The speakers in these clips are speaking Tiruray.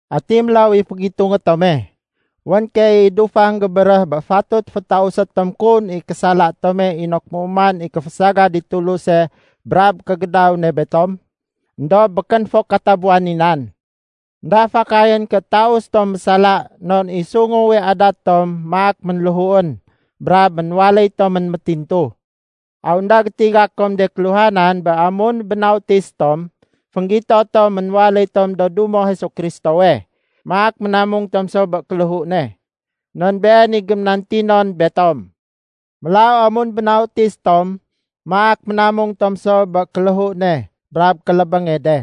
Ati mélaw i fégitungé tome? Wén keey i dufang gébéréh bé fatut fétausé tom kun i késala tome inok méuman i kéfésagad i Tuluse brab kégédaw ne betom. Endob békén fo katabuwan i nan. Enda fakayén ké taus tom mésala non i sunguwe adat tom maak ménléhuén brab ménwaléy tomén métintu. Aw énda gétiga kom de kéluhanan bé amun bénautis tom, fénggito tom ménwaléy tom do dumo Jesu Kristowe, maak ménamung tom so bé kéléhu ne? Non Been i géménantinon betom. Mélaw amun bénautis tom maak ménamung tom so bé kéléhu ne brab kélébénge de.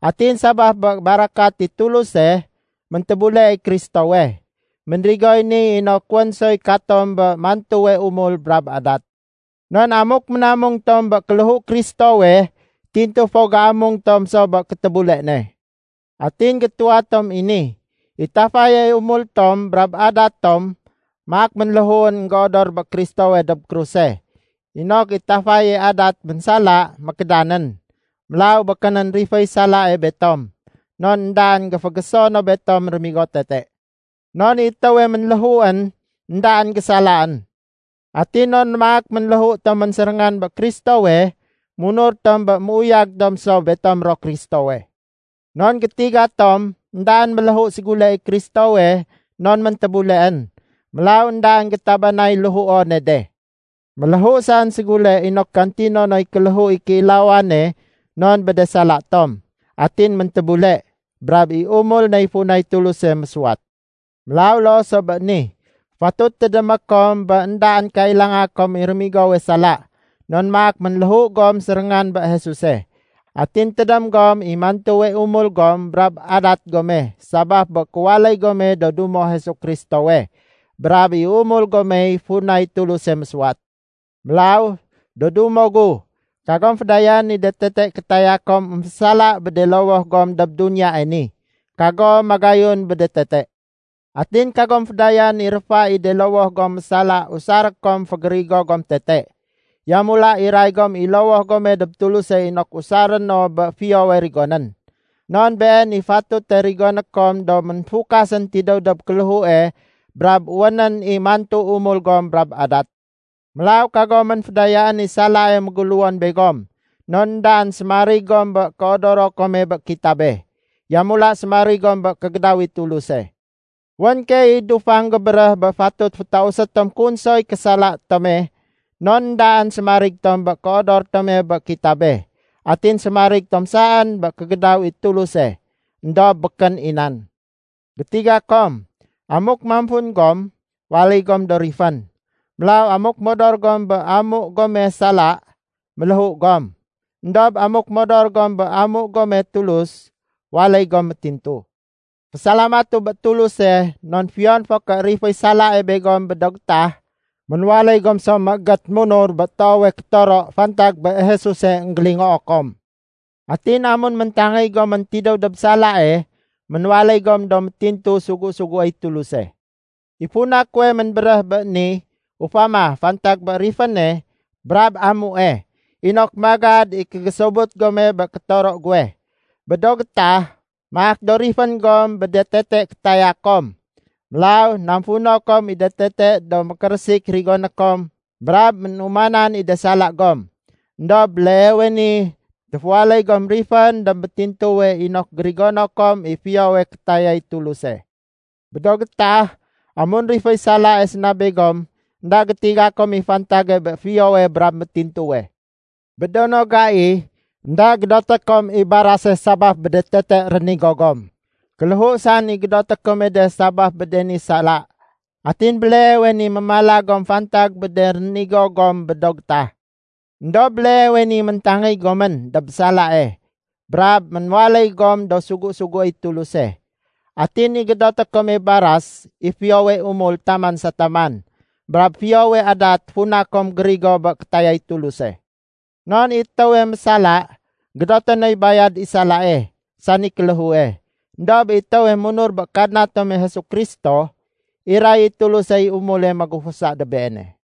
Atin sabaf bé barakat i Tuluse, méntébule i Kristowe. Ménrigoy ni inok wén soy katom bé mantuwe umul brab adat. Non amuk ménamung tom bé kéléhu Kristowe, tintu fo géamung tom so bé kétébule ne. Atin gétuwa tom i ni, i tafaye umul tom brab adat tome maak ménléhuén énggéodor bé Kristowe dob kruse, inok i tafaye adat ménsala mékédanén. Mélaw békénén riféy salae betom, non éndaén géfégéso no betom rémigo tete. Non i étéwe ménléhuén, éndaén gésalaén. Atin non maak ménléhu tomén séréngan bé Kristowe, munur tom bé méuyag tom so betom ro Kristowe. Non gétiga tom éndaén méléhu ségule i Kristowe non méntébuleén. Mélaw éndaén gétabanay léhuone de. Ménléhu saén ségule inok gantino noy kéléhu i kéilawane non bé de sala tom. Atin méntébule, brab i umul ney funay Tuluse mésuwat. Mélaw loo so bé ni, fatut tédémé kom bé éndaén kailanga kom i rémigowe sala, non maak ménléhu gom séréngan bé Jesuse. Atin tédém gom i mantuwe umul gom brab adat gome sabaf bé kéwaléy gome do dumo Jesu Kristowe brab i umul gomey funay Tuluse mésuwat. Mélaw, do dumo gu, kagom fédayaén i de tete kétaya kom émfésala bé de lowoh gom dob duniyae ni. Kagom magayun bé de tete. Atin kagom fédayaén i réfa i de lowoh gom mésala usaré kom fégérigo gom tete. Yamula iray gom i lowoh gome dob Tuluse inok usaré no bé fiyowe rigonén. Non been i fatute rigoné kom do ménfukasén tidéw dob kéléhue brab wénén i mantu umul gom brab adat. Mélaw kagomén fédayaén i salae méguléwon begom, non éndaén sémarig gom bé kéodoro kome bé kitabe. Yamula sémarig gom bé kégédaw i Tuluse. Wén keey i dufang gébéréh bé fatut fétausé tom kun soy késala tome non éndaén sémarig tom bé kéodor tome bé kitabe, atin sémarig tom saén bé kégédaw i Tuluse. Endob békén i nan. Gétiga kom, amuk mamfun gom, waléy gom do rifén. Mélaw amuk modor gom bé amu gome sala, méléhu gom. Endob amuk modor gom bé amu gome Tulus, waléy gom métintu. Fésalamatu bé Tuluse non fiyon fo ké riféy salae begom bé do gétah, ménwaléy gom so méégét munur bé toowe kétoro fantag bé Jesuse énggélingoo kom. Atin amun méntangéy gomén tidéw dob salae, ménwaléy gom do métintu sugu-suguéy Tuluse. I funa kuwe ménbéréh bé ni ufama fantag bé riféne brab amue, inok magad i kégésobut gome bé kétoro guwe. Bé do gétah, maak do rifén gom bé de tete kétaya kom. Mélaw namfuno kom i de tete do mékérésik rigoné kom brab ménumanan i de sala gom. Endob béleewe ni téféwaléy gom rifén dob métintuwe inok gérigono kom i fiyowe kétayay Tuluse. Bé do gétah, amun riféy salae séna begom, énda gétiga kom i fantage bé fiyowe brab métintuwe. Bé do no gai, énda gédoté kom i barase sabaf bé de tete rénigo gom. Kéléhu saén i gédoté kome de sabaf bé de ni sala. Atin béleewe ni mémala gom fantag bé de rénigo gom bé do gétah. Endob béleewe ni méntangéy gomén dob salae brab ménwaléy gom do sugu-suguéy Tuluse. Atin i gédoté kome baras i fiyowe umul taman sa taman brab fiyowe adat funa kom gérigo bé kétayay Tuluse. Non i étéwe mésala, gédote noy bayad i salae, sani kéléhue. Endob i étéwe munur bé Kadna tome Jesu Kristo, iray i Tulusey umule magufusa dob beene.